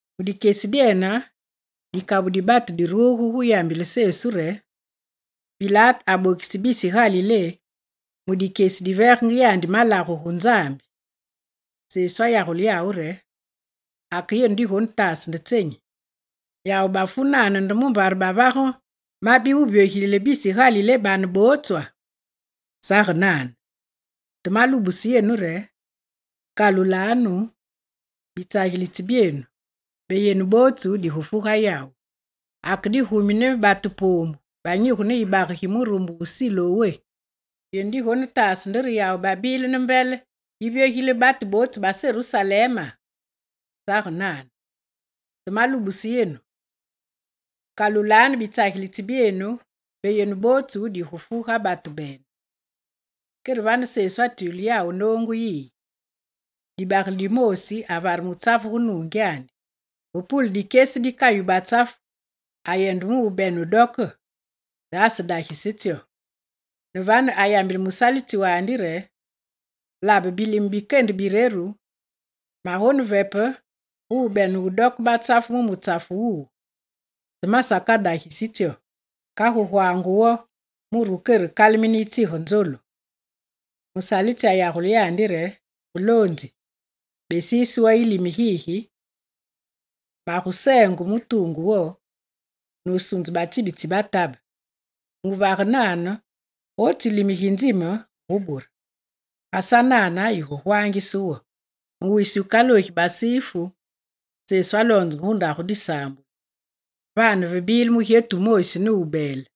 Mu dikyesi dyene, dikabu di batu diruge gu yambile Sesu re: «Pilate abokise bisi Galilé mu dikyesi diveegenge yandi malagu gu Nzambi.» Sesu ayagule yawu re: «Ake yenu digonetaase nde tsenyi? Yawu bafu nane nde mumbare bavage mabi wuvyogilile bisi Galilé bane botswa? Sage nane, te malubuse yenu re: kalulanu bitsagilitsi byenu mbe yenu bootsu digufu ga yawu. Ake digumi ne batu poombu banyigu ne yibage gi murumbe wu Silowé, yenu digonetaase nde re yawu babile ne mbele yivyogilile batu bootsu ba Serusalema? Sage nane, te malubuse yenu: kalulanu bitsagilitsi byenu mbe yenu bootsu digufu ga batu bene.» Kere vane Sesu atwile yawu noongu yiyi: «Dibagele dimoosi avare mutsafu gu nuungyandi. Ve pule dikyesi dikayu batsafu, ayende mubene wudoke te asedagise tsyo. Ne vane, ayambile musalitsi wandi re: “Labe bilime bikende bireru magonevepe gu bene wudoke batsafu mu mutsafu wuwu, te masakadagisi tsyo. Kagu gwaange wo mure wukerekalemine yitsige nzolu.” Musalitsi ayagule yandi re: “Muloonzi, besiise wo yilime gigi, maguseenge mu tuungu wo, nusunze batsibi tsi batabe. Muvage nane, gotsu yilime gi nzime wugubure. Ga sanane yigugwaangise wo.”» Mu wisi wukaloogi Basifu Sesu aloonzenge gu ndagu disaambulu. Vane vebile mugyetu wumoosi nubeele: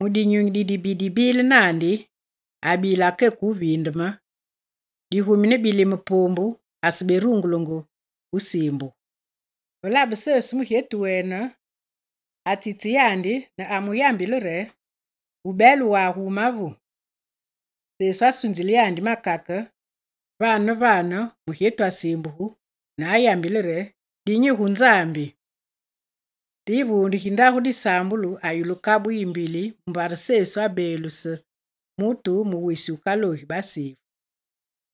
mu dinyunyi didibi dibile naandi, abila keke wuviindeme, digumi ne bilime poombu aseberungulenge wusiimbugu. Ve labe Sesu mugyetu wene, atsitse yandi ne mu yambile re: «Wubeele wagu wumavu.» Sesu asunzile yandi makake, vane ne vane mugyetu asiimbugu ne ayambile re: «Dinyi gu Nzambi.» Te yivuunde gi ndagu disaambulu ayulu kabu yimbili mumbare Sesu abeeluse mutu mu wisi wukaloogi Basifu.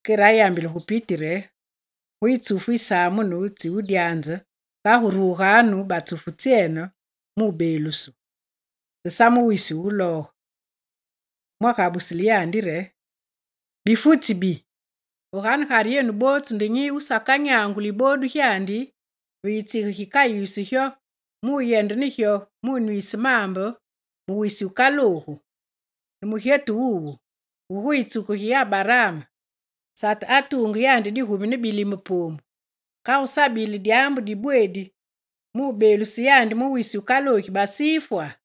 Kere ayambile gu piti re: «Guyi tsufu yisamunu tsi wudyaanze kagu ruganu batsufu tsyene mubeelusu, te sa mu wisi wulooge.» Fumu agabusile yandi re: «Bifutsi bibi, ve ganegare yenu bootsu nde nyi wusakanyanguli yiboodu gyandi ve yitsige gikayisu gyo muyende ne gyo munwiise maambe mu wisi wukaloogu? Ne mugyetu wuwu, wu gu yitsuku gi Abaraam, Sate atuunge yandi digumi ne bilime poombu, kagu sabile dyaambu dibweedi mubeeluse yandi mu wisi wukaloogi basifwa?»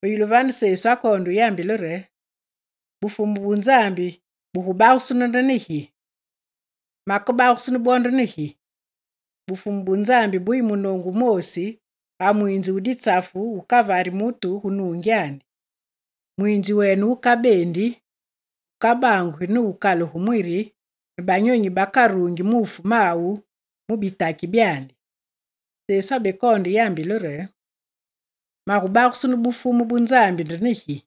Ve yulu vane, Sesu akoonde wuyambile re: «Bufumu bu Nzambi bugubagusunu nde ne gi? Makebagusunu bwo nde ne gi? Bufumu bu Nzambi buyi munoongu wumoosi ga mwiinzi wu ditsafu wukavari mutu gu nungyandi. Mwiinzi wene wukabeendi, wukabangugi ne wukakalugi mwiri ne banyonyi bakaruungi muufu mawu mu bitaki byandi.» Sesu abekoonde yambile re: «Magubagusunu Bufumu bu Nzambi nde ne gi?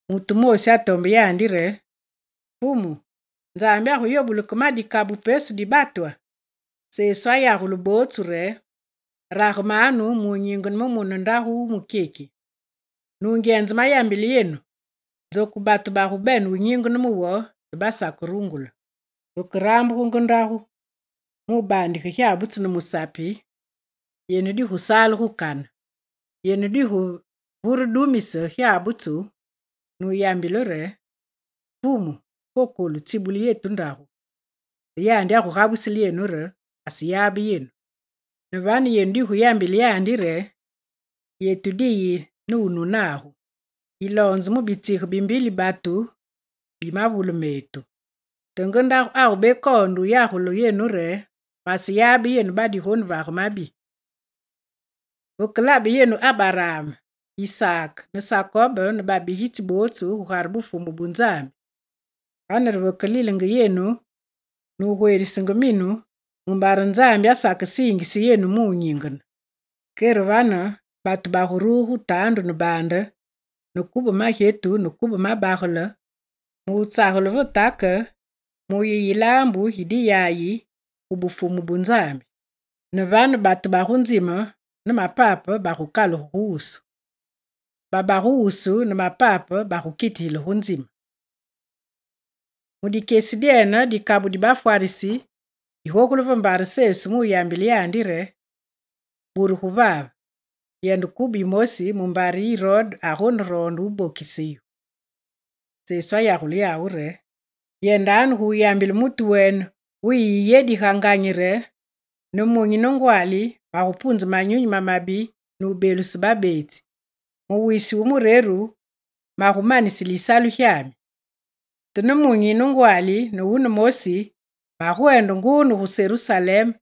Mutu wumoosi atombe yandi re: «Fumu, Nzambi aguyobule ke ma dikabu pesu di batwa?» Sesu ayagule bootsu re: «Ragemanu mu nyingene mu mune wu ndagu wu mukyeki. Nungyenze, mayambile yenu, nzoku batu bagubene wunyingene mu wo te basakerungule. Vekerambugu nge ndagu mu baandige gyabutsu ne musapi yenu digusale gu kane. Yenu diguvuredumise gyabutsu nuyambile re: “Fumu kokolu tsibulile yetu ndagu.” Te yandi agugabusile yenu re: “Maseyabe yenu.” Ne vane yenu diguyambile yandi re: “Yetu diyi ne wunu nagu, yiloonze mu bitsigi bi mbili batu bi mavule metu.” Te nge ndagu agubekoonde yagule yenu re: “Maseyabe yenu badigonevage mabi!” Veke labe yenu Abaraam, Isaak ne Sakob ne babigitsi bootsu, gugare Bufumu bu Nzambi, vane re vekelilenge yenu, nugwerisenge minu mumbare Nzambi asakesiingise yenu mu nyingene. Kere vane batu baguruge gu taandu ne baande ne kube magyetu ne kube mabagele mutsagele ve take muyi yilaambu gi diyayi gu Bufumu bu Nzambi. Ne vane batu bagu nzime ne mapape baguvyoge gu wusu, baba gu wusu ne mapape bagukitigile gu nzime.» Mu dikyesi dyene dikabu di bafwarisi digogule ve mbare Sesu mu yambile yandi re: «Burugu vave, yende kube yimosi mumbare Irode agoneroonde wubokise yu.» Sesu ayagule yawu re: «Yendanu guyambile mutu wene wu yiyedi ga nganyi re: “Ne munyi ne ngwaali magupunze manyunyi mamabi nubeeluse babeetsi, mu wisi wu mureru magumanisile yisalu gyami.” Te nemunyi ne ngwaali ne wunemosi, magwende nguu ne gu Serusalem,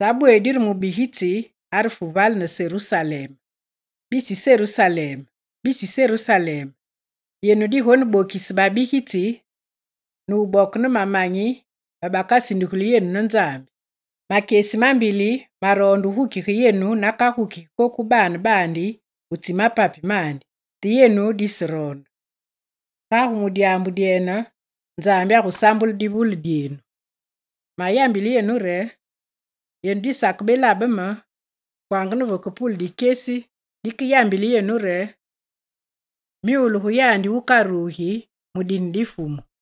sabweedi re mubigitsi arefu vale ne Serusalem. Bisi Serusalem, bisi Serusalem, yenu digonebokise babigitsi, ne wuboke ne mamanyi bakasindugulu yenu ne Nzambi. Makyesi mambili maroondenge wugukige yenu nakagukigi koku baane baandi gu tsi mapapi mandi, te yenu diseroonde. Kagu mu dyaambu dyene, Nzambi agusambule divule dyenu. Mayambile yenu re: yenu disakebelabe me kwanga ne vakepule dikyesi dikeyambile yenu re: “Myule gu yandi wukarugi mu dine di Fumu.”»